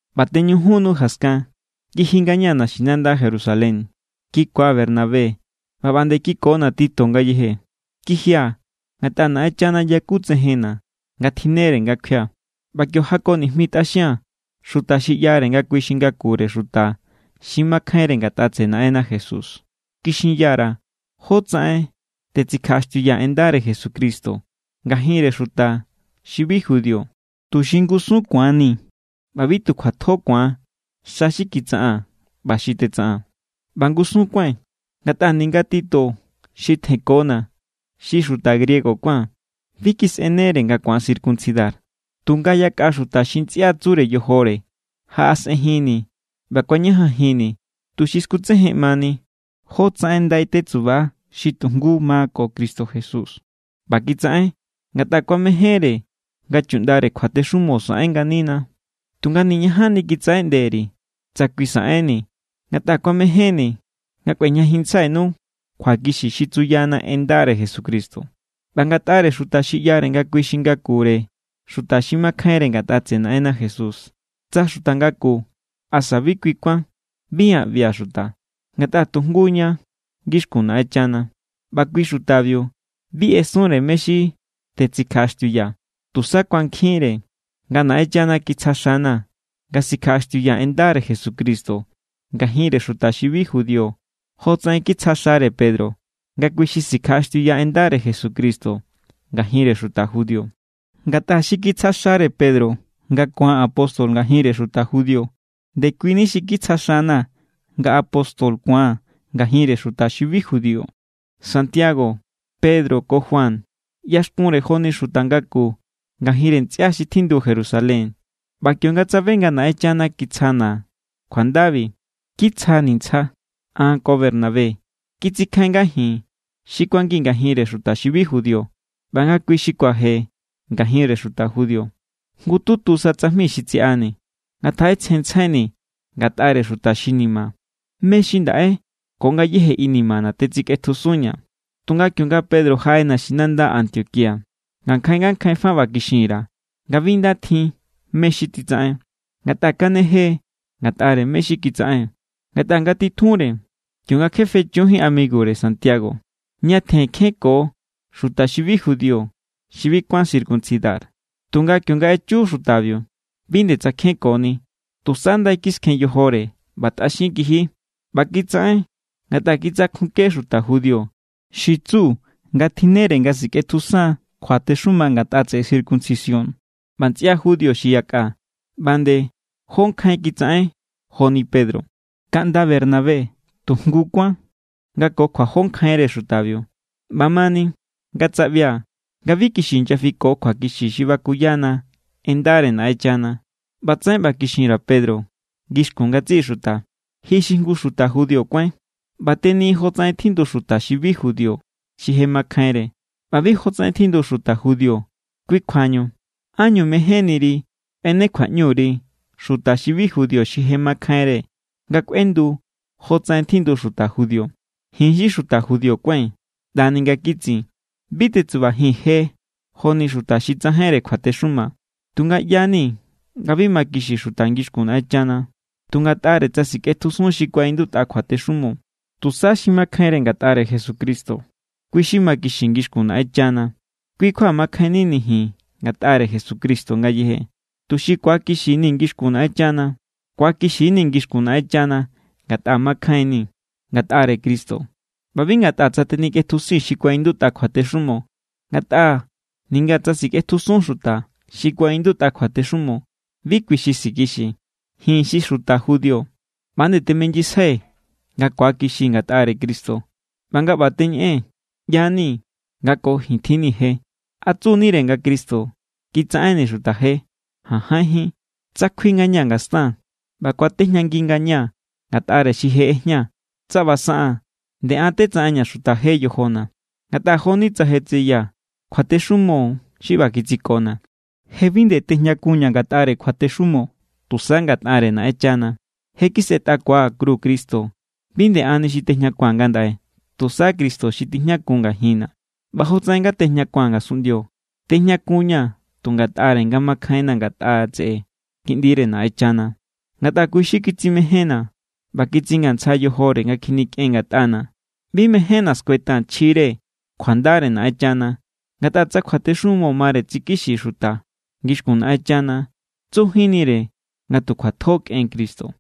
ꞌBa teñujun nu jaskan, kiji ngañaa̱ naxinanda Jerusalén. Kikua̱ Bernabé, ꞌba ꞌba nde kikona̱ Tito ngayeje. Kijia̱ ngatꞌa Naꞌenchana yakutsejenna̱ nga tjinnere nga kjuia̱. ꞌBa kio jako nijmitꞌaxia̱n xuta xi ꞌyare nga kui xi ngakure xuta xi makjainre ngatꞌa tseꞌe Naꞌenna Jesús. Kixinya_ra̱ jótsaꞌen tetsikjaꞌaxtiuyaa̱ en ndare Jesucristo ngajinre xuta xi bi judío, tuxi ngusun ku̱anni̱ ꞌba bi tu kjuatjo ku̱an xa xi kitsaꞌaa̱n ꞌba xi tetsaꞌaa̱n. ꞌBa ngusun kuái̱n, ngatꞌa ninga Tito xi tjenkona̱ xi xuta griego kuán, bi kisꞌenere nga ku̱an circuncidar. Tunga yakꞌa xuta xi ntsꞌia tsure yojore jaꞌasꞌenjinni̱ ꞌba kuañajanjinni̱ tuxi skutsejenꞌmani jótsaꞌen ndai tetsuba xi tu jngu ma ko Cristo Jesús. ꞌBa kitsaꞌen, ngatꞌa kuamejénre nga chuꞌndare kjuatexumo saꞌen nganina. Tunga niñajanni kitsaꞌeꞌnde_ri̱ tsa kui saꞌenni̱, ngatꞌa kuamejénni̱ nga kꞌuejñajinntsjainu kjuakixi xi tsuyana en ndare Jesucristo. ꞌBa ngatꞌare xuta xi ꞌyare nga kui xi ngakure xuta xi makjainre ngatꞌa tseꞌe Naꞌenna Jesús, tsa xuta ngaku asa bi kui kuán, bi an ꞌbia̱ xuta, ngatꞌa tu jngu ña ngixkun Naꞌenchana. ꞌBa kui xutabiu bi ꞌesunre mé= xi tetsikjaꞌaxtiuyaa̱. Tusa kuankjinre nga Naꞌenchana kitsja xana̱ nga sikjaꞌaxtiuyaa̱ en ndare Jesucristo ngajinre xuta xi bi judío jotsaꞌen kitsja xare Pedro nga kui xi sikjaꞌaxtiuya en ndare Jesucristo ngajinre xuta judío. Ngatꞌa xi kitsja xare Pedro nga ku̱an apóstol ngajinre xuta judío, ndekuini xi kitsja xana̱ nga apóstol ku̱an ngajinre xuta xi bi judío. Santiago, Pedro ko Juan ꞌyaxkunre joni xuta ngaku ngajinre ntsꞌia xi tjindu Jerusalén. ꞌBa kionga tsabe nga Naꞌenchana kitsjana̱ kjuandabi, kitsjani̱ ntsja an ko Bernabé. Kitsikjain nga ji̱n xi kuangii̱n ngajinre xuta xi bi judío, ꞌba nga kui xi kuaje ngajinre xuta judío. Jngututu sa tsajmi xi tsiꞌani̱, nga ngatjaꞌetsjenntsjaini̱ ngatꞌare xuta ni̱ma̱, mé= xi ndaꞌe ko ngayéje inimana̱ tetsikꞌetjusunña̱. Tunga kionga Pedro jaꞌe naxinanda Antioquía, ngankjain ngakjain fa ꞌba kixin_ra̱ nga bi nda tjin mé= xi titsaꞌen. Ngatꞌa kanejee̱ ngatꞌare mé= xi kitsaꞌen. Ngatꞌa ngatitjunre, kionga kje fechujín amigure Santiago, ñatjen kjenko xuta xi bi judío xi bi kuán circuncidar. Tunga kionga echu xutabiu, bi nde tsakjenkoni, tusa ndai kiskjen yojore ꞌba tꞌaxin kiji. ꞌBa kitsaꞌen ngatꞌa kitsakjunke xuta judío xi tsu nga tjinnere nga sikꞌetjusan kjuatexuma ngatꞌa tseꞌe circuncisión. ꞌBa ntsꞌia judío xi yakꞌa ꞌba nde jó nkjain kitsaꞌen joni Pedro. Kaꞌnda Bernabé tu jngu kuán nga ko kjuajó nkjainre xutabiu. ꞌBamani, nga tsaꞌbia̱ nga bi kixi inyafiko kjuakixi xi bakuyana en ndare Naꞌenchana, ꞌbatsaꞌen ꞌba kixin_ra̱ Pedro ngixkun ngatsiꞌi xuta: “Ji xi jngu xuta judío kuáin, ꞌba teni jotsaꞌen tjindu xuta xi bi judío xi je makjainre, ꞌba bi jotsaꞌen tjindu xuta judío. Kui kjuañu, ¿ánñu mejénniri kꞌuene kjuaꞌñu_ri xuta xi bi judío xi je makjainre nga kꞌuendu jotsaꞌen tjindu xuta judío?” Ji̱n= xi xuta judío kuái̱n ꞌndani nga kitsin, bi tetsubajii̱n je joni xuta xi tsajainre kjuatexuma. Tunga ꞌya=ni nga bi makixi xuta ngixkun Naꞌenchana tu ngatꞌare tsa sikꞌetjusun xi kuaꞌindutꞌa kjuatexumo. Tusa xi makjainre ngatꞌare Jesucristo, kui xi makixi ngixkun Naꞌenchana. Kui kjua makjainnini̱ ji̱n ngatꞌare Jesucristo ngayeje, tuxi ku̱akixini̱ ngixkun Naꞌenchana. Ku̱akixi=ni̱ ngixkun Naꞌenchana ngatꞌa makjainni̱ ngatꞌare Cristo ꞌba bi ngatꞌa tsa tenikꞌetjusii̱n xi kuaꞌindutꞌa kjuatexumo, ngatꞌa ninga tsa sikꞌetjusun xuta xi kuaꞌindutꞌa kjuatexumo, bi kui xi sikixi. Ji̱n xi xuta judío ꞌba nde teminyisjai̱ nga ku̱akixii̱ ngatꞌare Cristo. ꞌBa nga ꞌba teñeꞌee̱n, ꞌyanii̱ nga ko ji̱n tjinni̱ je. ¿A tsu=nire nga Cristo kitsaꞌenni̱ xuta je? ¡Jajainjín! Tsa kjui ngañaa̱ ngastaa̱n, ꞌba kuatejñangi ngañaa̱ ngatꞌare xi je ꞌejñaa̱, tsa ꞌba saꞌaa̱n, nde an= tetsaꞌenña̱ xuta je yojona̱. Ngatꞌa jo=ni tsa je tseyaa̱. Kjuatexumo xi ꞌba kitsikona̱. Je bi nde tejñakunña̱ ngatꞌare kjuatexumo, tusa ngatꞌare Naꞌenchana. Je kisꞌetꞌakua̱ kru Cristo. Bi nde anni xi tejñakua̱n ngandaꞌe. Tusa Cristo xi tijñakun ngajinna̱. ꞌBa jotsaꞌen nga tejñakua̱n ngasunꞌndio, tejñakunñaa̱ tu ngatꞌare nga makjainna̱ ngatꞌa tseꞌe Kiꞌndire Naꞌenchana. Ngatꞌa kui xi kitsimejénna̱ ꞌba kitsingantsja yojore nga kjinikꞌen ngatꞌana̱. Bi mejénna̱ skuetaa̱n chjire kjuandare Naꞌenchana. Ngatꞌa tsa kjuatexumo mare tsikixi xuta ngixkun Naꞌenchana, tsujínnire nga tu kjuatjo kꞌen Cristo.